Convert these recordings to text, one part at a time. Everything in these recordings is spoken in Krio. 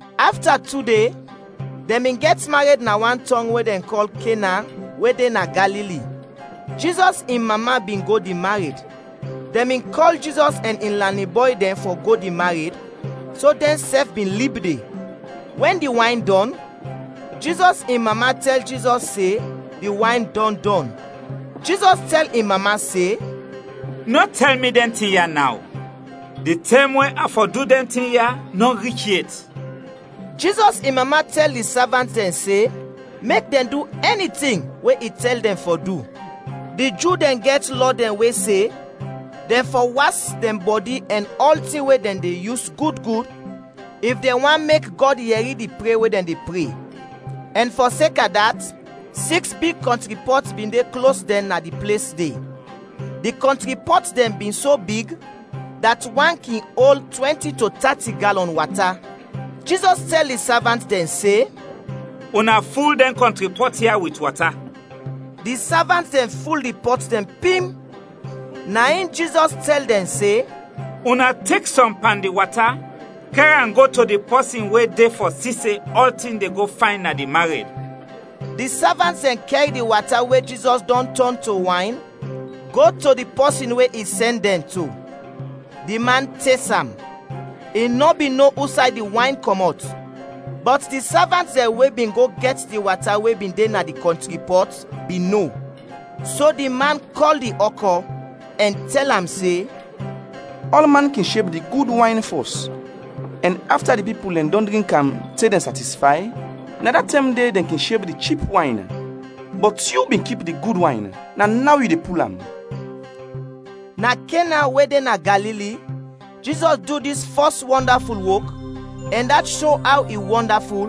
Afta tu de, dɛn bin gɛt mared na wan tɔng we dɛn kɔl Kena we de na Galili. Jizɔs in mama bin go di mared. Dɛn bin kɔl Jizɔs ɛn in lanin bɔy dɛn fɔ go di mared, so dɛnsɛf bin lib de. Wɛn di wayn dɔn, Jizɔs in mama tɛl Jizɔs se di wayn dɔn dɔn. Jizɔs tɛl in mama se, “Nɔ tɛl mi dɛn tin ya naw. Di tɛm we a fɔ du dɛn tin ya nɔ rich yet.” Jizɔs in mama tɛl di savant dɛn se mek dɛn du ɛni tin we i tɛl dɛn fɔ du. Di Ju dɛn gɛt lɔ dɛn we se, dɛn fɔ was dɛn bɔdi ɛn ɔltin we dɛn de yus gud gud, if dɛn want mek Gɔd yɛri di pre we dɛn de pre; ɛn fɔseka dat, siks big kɔntri pɔt bin de klos dɛn na di ples de; di kɔntri pɔt dɛn bin so big, dat wan kin ol twɛnti to tati galɔn wata. Jizɔs tɛl di savant dɛn se, “Una ful dɛn kɔntri pɔt ya wit wata.” Di savant dɛn ful di pɔt dɛn pim. Na in Jizɔs tɛl dɛn se, “Una tek sɔm pan di wata, kɛr am go to di pɔsin we de fɔ si se ɔltin de go fayn na di mared.” Di savant dɛn kɛr di wata we Jizɔs dɔn tɔn to wayn go to di pɔsin we i sɛn dɛn to; di man tes am. I nɔ bin no usay di wayn kɔmɔt, bɔt di savant dɛn we bin go gɛt di wata we bin de na di kɔntri pɔt bin no; so di man kɔl di ɔkɔ, ɛn tɛl am se, “Ɔlman kin sheb di gud wayn fɔs, ɛn afta di pipul dɛn dɔn drink am te dɛn satisfay, na da tɛm de dɛn kin sheb di chip wayn. Bɔt yu bin kip di gud wayn, na naw yu de pul am!” Na Kena we de na Galili, Jizɔs du dis fɔs wɔndaful wok, ɛn dat sho aw i wɔndaful,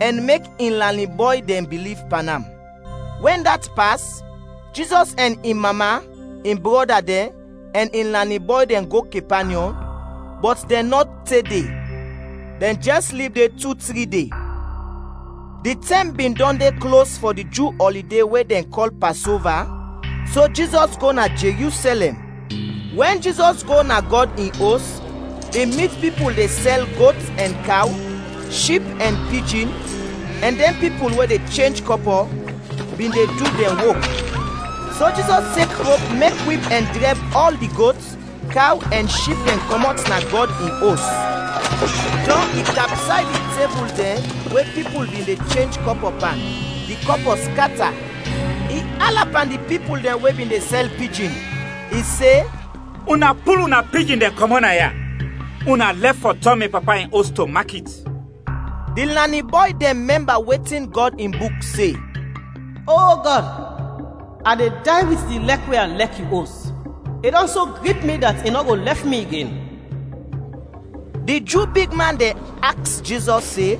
ɛn mek in lanin bɔy dɛn biliv pan am. Wɛn dat pas, Jizɔs ɛn in mama, in brɔda dɛn, ɛn in lanin bɔy dɛn go Kepanyɔm, bɔt dɛn nɔ te de, dɛn jɛs lib de tu, tri de. Di tɛm bin dɔn de klos fɔ di Ju ɔlide we dɛn kɔl Pasova, so Jizɔs go na Jerusɛlɛm. Wɛn Jizɔs go na Gɔd in Os, i mit pipul de sɛl got ɛn kaw, ship ɛn pijin, ɛn dɛn pipul we de chenj kɔpɔ, bin de du dɛn wok. So Jizɔs tek rop mek wip ɛn drɛb ɔl di got, kaw ɛn ship dɛn kɔmɔt na Gɔd in Os; dɔn i kapsay di tebul dɛn we pipul bin de chenj kɔpɔ pan, di kɔpɔ skata. I ala pan di pipul dɛn we bin de sɛl pijin. I se, “Una pul una pijin dɛn kɔmɔt naya! Una lɛf fɔ tɔn mi Papa in Os to makit!” Di lanin bɔy dɛn mɛmba wetin Gɔd in Buk se, “O Gɔd, a de day wit di lɛk we a lɛk yu os, i dɔn so grip mi dat i nɔ go lɛf mi igen.” Di Ju bigman dɛn aks Jizɔs se,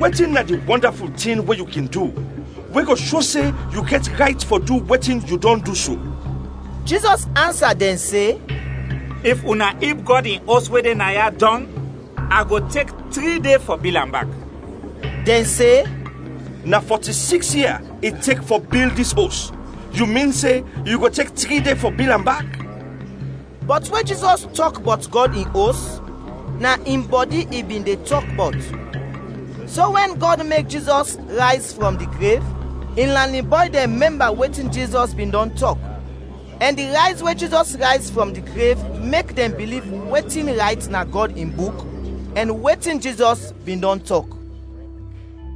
“Wetin na di wɔndaful tin we yu kin du, we go sho se yu gɛt rayt fɔ du wetin yu dɔn du so?” Jizɔs ansa dɛn se, “If una ib Gɔd in Os we de naya dɔng, a go tek tri de fɔ bil am bak.” Dɛn se, “Na fɔti-siks ia i tek fɔ bil dis os, yu min se yu go tek tri de fɔ bil am bak?” Bɔt we Jizɔs tɔk bɔt Gɔd in Os, na in bɔdi i bin de tɔk bɔt. So wɛn Gɔd mek Jizɔs rayz frɔm di grev, in lanin bɔy dɛn mɛmba wetin Jizɔs bin dɔn tɔk, ɛn di rayz we Jizɔs rayz frɔm di grev mek dɛn biliv wetin rayt na Gɔd in Buk, ɛn wetin Jizɔs bin dɔn tɔk.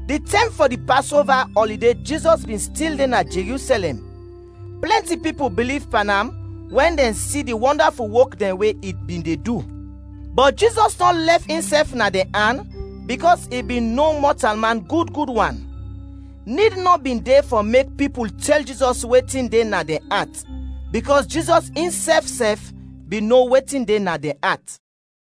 Di tɛm fɔ di Pasova ɔlide Jizɔs bin stil de na Jerusɛlɛm, plɛnti pipul biliv pan am wɛn dɛn si di wɔndaful wok dɛn we i bin de du. Bɔt Jizɔs nɔ lɛf insɛf na dɛn an bikɔs i bin no mɔtalman gud gud wan. Nid nɔ bin de fɔ mek pipul tɛl Jizɔs wetin de na dɛn at, bikɔs Jizɔs insɛf sɛf bin no wetin de na dɛn at.